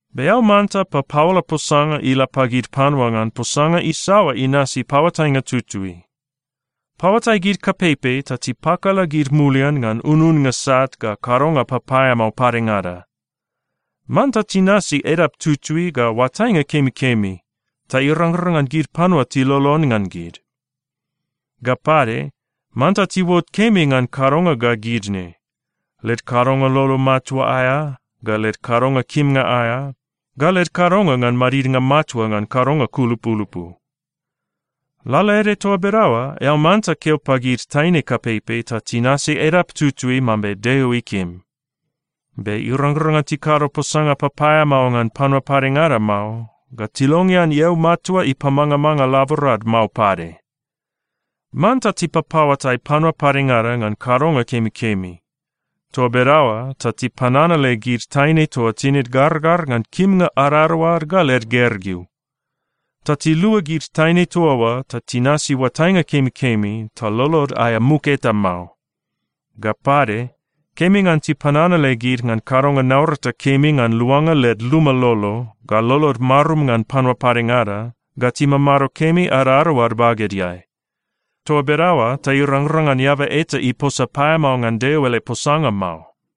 Be eao manta papaola posanga ila pagid panua ngan posanga isaoa inasi paoatainga tutui. Paoatai gid kapeipei ta tipakala gid mulian ngan ununnga sat ga kadonga papaeamao padengada. Manta tinasi edap tutui ga oatainga kemikemi, ta irangrang ngan gid panua tilolon ngan gid. Ga pade, manta tiuot kemi ngan kadonga ga gid ne: led kadonga lolo matua aea, ga led kadonga kimnga aea, ga led kadonga ngan madidnga matua ngan kadonga kulupulupu. Lalaede toa bedaoa, eao manta keo pagid taine kapeipei ta tinasi edap tutui mambe Deo ikim. Be irangrang ngan tikado posanga papaeamao ngan panua padengada mao, ga tilongean eau matua ipamangamanga laborad mao pade. Manta tipapaoatai panua padengada ngan kadonga kemikemi. Toa bedaoa ta tipananale gid taine toa tinid gargar ngan kimnga adadaoad ga led gergeu. Ta tilua gid taine toa oa ta tinasi oatainga kemikemi ta lolod aea muk eta mao. Ga pade, kemi ngan tipananale gid ngan kadonga naurata kemi ngan luanga led luma lolo, ga lolod marum ngan panua padengada, ga timamado kemi adadaoad bagedeai. Toa bedaoa ta irangrang ngan eaba eta iposa paeamao ngan Deo ele posanga mao.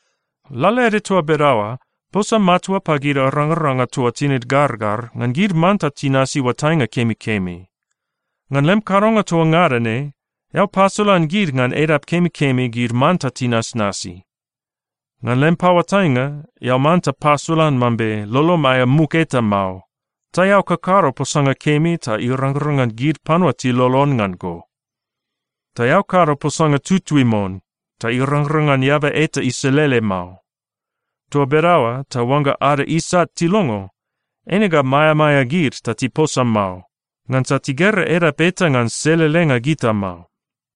Lalaede toa bedaoa, posa matua pagid arangaranga toa tinid gargar, ngan gid manta tinasi oatainga kemikemi. Ngan lem kadonga toa ngada ne, eao pasolan gid ngan edap kemikemi gid manta tinasnasi. Ngan lem paoatainga, eao manta pasolan mambe lolom aea muk eta mao, ta eao kakado posanga kemi ta irangrang ngan gid panua tilolon ngan go. Ta eao kado posanga tutui mon ta irangrang ngan eaba eta iselele mao. Toa bedaoa ta oangga ada isat tilongo, eine ga maeamaea gid ta tiposa mao, ngansa tigera edap eta ngan selelenga gita mao.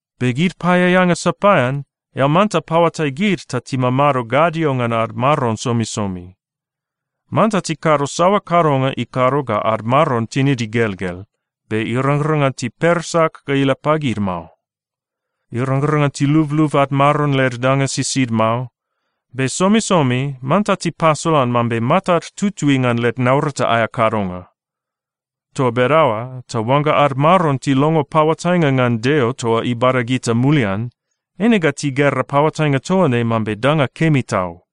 Be gid paeaeanga sapaean, eao manta paoatai gid ta timamado gadio ngan ad maron somisomi. Manta tikado saoa kadonga ikado ga ad maron tinid igelgel, be irangrang ngan tipersak ga ila pagid mao. Irangrang ngan tilublub ad maron led danga sisid mao. Be somisomi manta tipasolan mambe matad tutui ngan led naurata aea kadonga. Toa bedaoa ta oangga ad maron tilongo paoatainga ngan Deo toa ibada gita mulian, eine ga tigera paoatainga toa ne mambe danga kemi tau.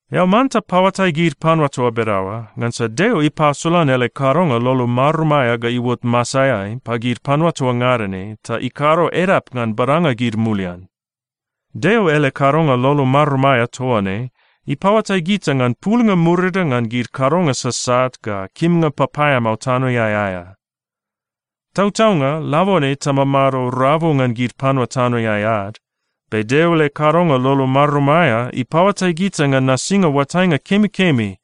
Eao manta paoatai gid panua toa bedaoa, ngansa Deo ipasolan ele kadonga lolo marum aea ga iuot masaeai pagid panua toa ngada ne ta ikado edap ngan badanga gid mulian. Deo ele kadonga lolo marum aea toa ne ipaoatai gita ngan pulnga murida ngan gid kadonga sasat ga kimnga papaeamao tanoeai aea. Tautaunga, labone tamamado rabu ngan gid panua tanoeai ad, be Deo ele kadonga lolo marum aea ipaoatai gita ngan nasinga oatainga kemikemi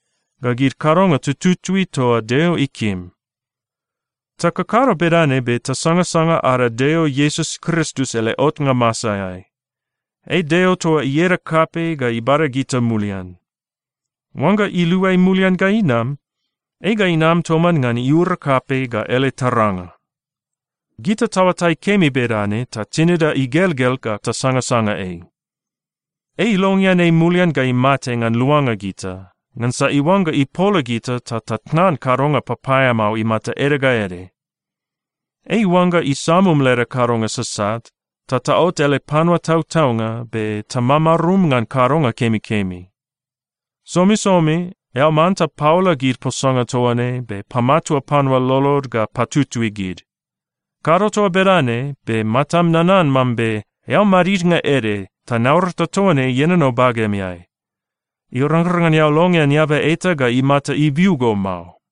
ga gid kadonga tututui toa Deo ikim. Takakado bedane be tasangasanga ada Deo Iesus Kristus ele otnga masaeai. Ei Deo toa ieda kapei ga ibada gita mulian. Oangga iluai mulian ga inam, ei ga inam toman ngan iura kapei ga ele taranga. Gita taoatai kemi bedane ta tinida igelgel ga tasangasanga ei. Ei ilongean ei mulian ga imate ngan luanga gita ngansa iuangga ipola gita ta tatnan kadonga papaeamao imata ede ga ede. Ei iuangga isamum leda kadonga sasat, ta taot ele panua tautaunga be tamamarum ngan kadonga kemikemi. Somisomi eao manta paola gid posanga toa ne be pamatua panua lolod ga patutui gid. Kado toa bedane be matam nanan mambe eao madidnga ede ta naurata toa ne ienono bagemeai. Irangrang ngan eao longean eaba eta ga imata ibiu go mao.